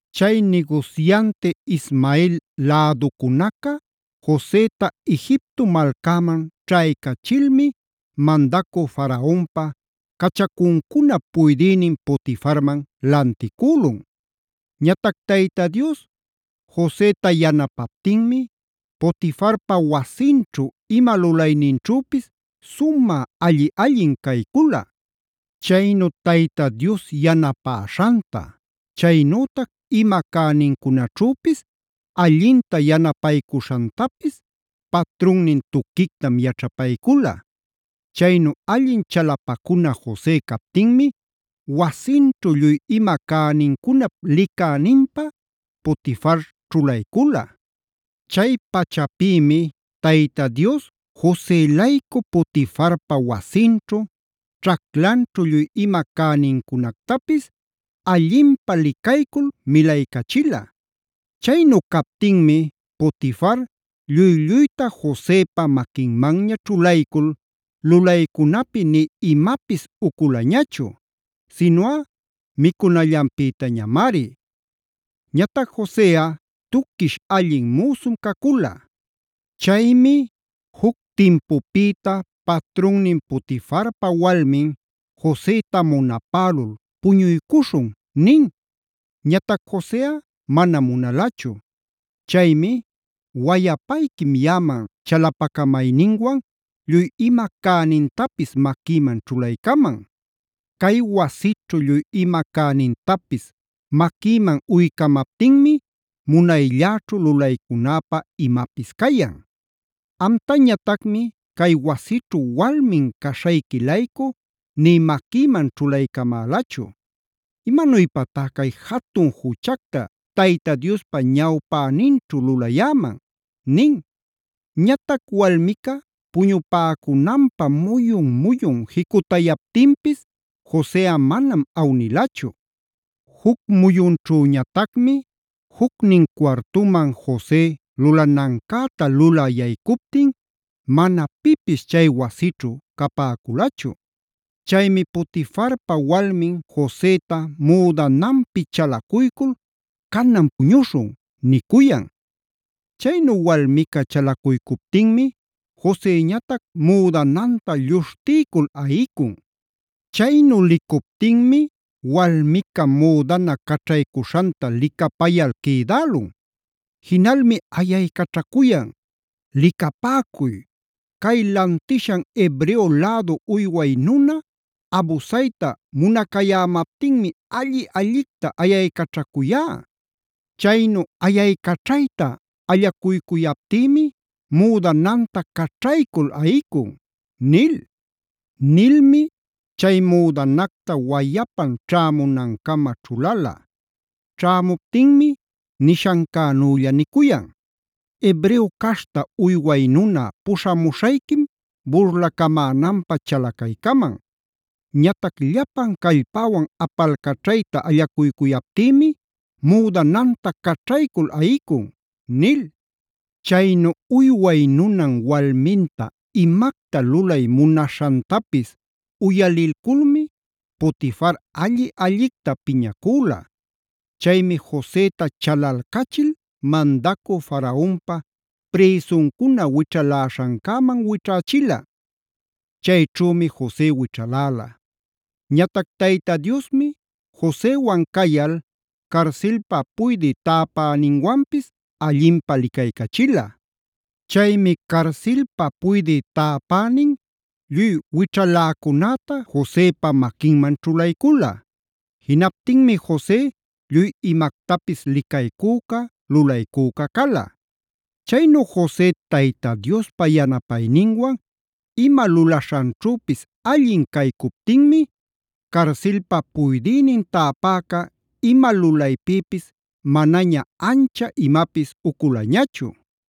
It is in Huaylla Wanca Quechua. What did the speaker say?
Chay nigusyanti Ismael läducunaca Joseta Egipto malcäman ćhaycachilmi mandacü Faraonpa cachacuncunap puydïnin Potifarman lanticülun. Ñatac Tayta Dios Josetaa yanapaptinmi Potifarpa wasinćhu ima lulayninćhüpis sumä alli-allin caycula. Chaynu Tayta Dios yanapäśhanta, chaynütac ima cänincunaćhüpis allinta yanapaycuśhantapis patrunnin tuquictam yaćhapaycula. Chaynu allin chalapacuna Jose captinmi wasinćhu lluy ima cänincunap licäninpä Potifar ćhulaycula. Chay pachapïmi Tayta Dios Jose-laycu Potifarpa wasinćhu, ćhaclanćhu lluy ima cänincunactapis allinpä licaycul milaycachila. Chaynu captinmi Potifar lluy-lluyta Josepa maquinmanña ćhulaycul lulaycunapi nï imapis uculañachu, sinuꞌa micunallanpïtañamari. Ñatac Joseꞌa tuquish, allin müsum cacula. Chaymi juc timpupïta patrunnin Potifarpa walmin Joseta munapälul: “Puñuycuśhun” nin. Ñatac Joseꞌa manam munalachu. Chaymi: “Wayapayquim yaꞌaman chalapacamayninwan lluy ima cänintapis maquïman ćhulaycaman. Cay wasićhu lluy ima cänintapis maquïman uycamaptinmi munaylläćhu lulaycunäpä imapis cayan. Amtañatacmi cay wasićhu walmin caśhayqui-laycu nï maquïman ćhulaycamälachu. ¿Imanuypatá cay jatun juchacta Tayta Diospa ñawpäninćhu lulayäman?” nin. Ñatac walmica puñupäcunanpä muyun-muyun jicutayaptinpis Joseꞌa manam awnilachu. Juc muyunćhüñatacmi jucnin cuartuman Jose lulanancäta lulä yaycuptin mana pipis chay wasićhu capäculachu. Chaymi Potifarpa walmin Joseta müdananpi chalacuycul: “Canan puñuśhun” nicuyan. Chaynu walmica chalacuycuptinmi Joseñatac müdananta lluśhtiycul ayicun. Chaynu licuptinmi walmica müdana caćhaycuśhanta licapayal quïdälun. Jinalmi ayaycaćhacuyan: “¡Licapäcuy!, cay lantishan Hebreo lädu uyway nuna abusayta munacayämaptinmi alli-allicta ayaycaćhacuyá. Chaynu ayaycaćhayta allacuycuyaptïmi müdananta caćhaycul ayicun” nil. Nilmi chay müdanacta wayapan ćhämunancama ćhulala. Ćhämuptinmi nishancänülla nicuyan: “Hebreo caśhta uyway nuna puśhamuśhayquim burlacamämanpä chalacaycaman. Ñatac llapan callpäwan apalcaćhayta allacuycuyaptïmi müdananta caćhaycul ayicun” nil. Chaynu uyway nunan walminta imacta lulay munaśhantapis uyalilculmi Potifar alli-allicta piñacüla. Chaymi Joseta chalalcachil mandacü Faraonpa prïsuncuna wićhaläśhancäman wićhächila. Chayćhümi Jose wićhaläla. Ñatac Tayta Diosmi Josewanb cayal carsilpa puydï täpäninwanpis allinpä licaycachila. Chaymi carsilpa puydï täpänin lluy wićhaläcunäta Josepa maquinman ćhulaycula. Jinaptinmi Jose lluy imactapis licaycüca, lulaycüca cala. Chaynu Jose Tayta Diospa yanapayninwan ima lulaśhanćhüpis allin caycuptinmi carsilpa puydïnin täpäca ima lulaypïpis manaña ancha imapis uculañachu.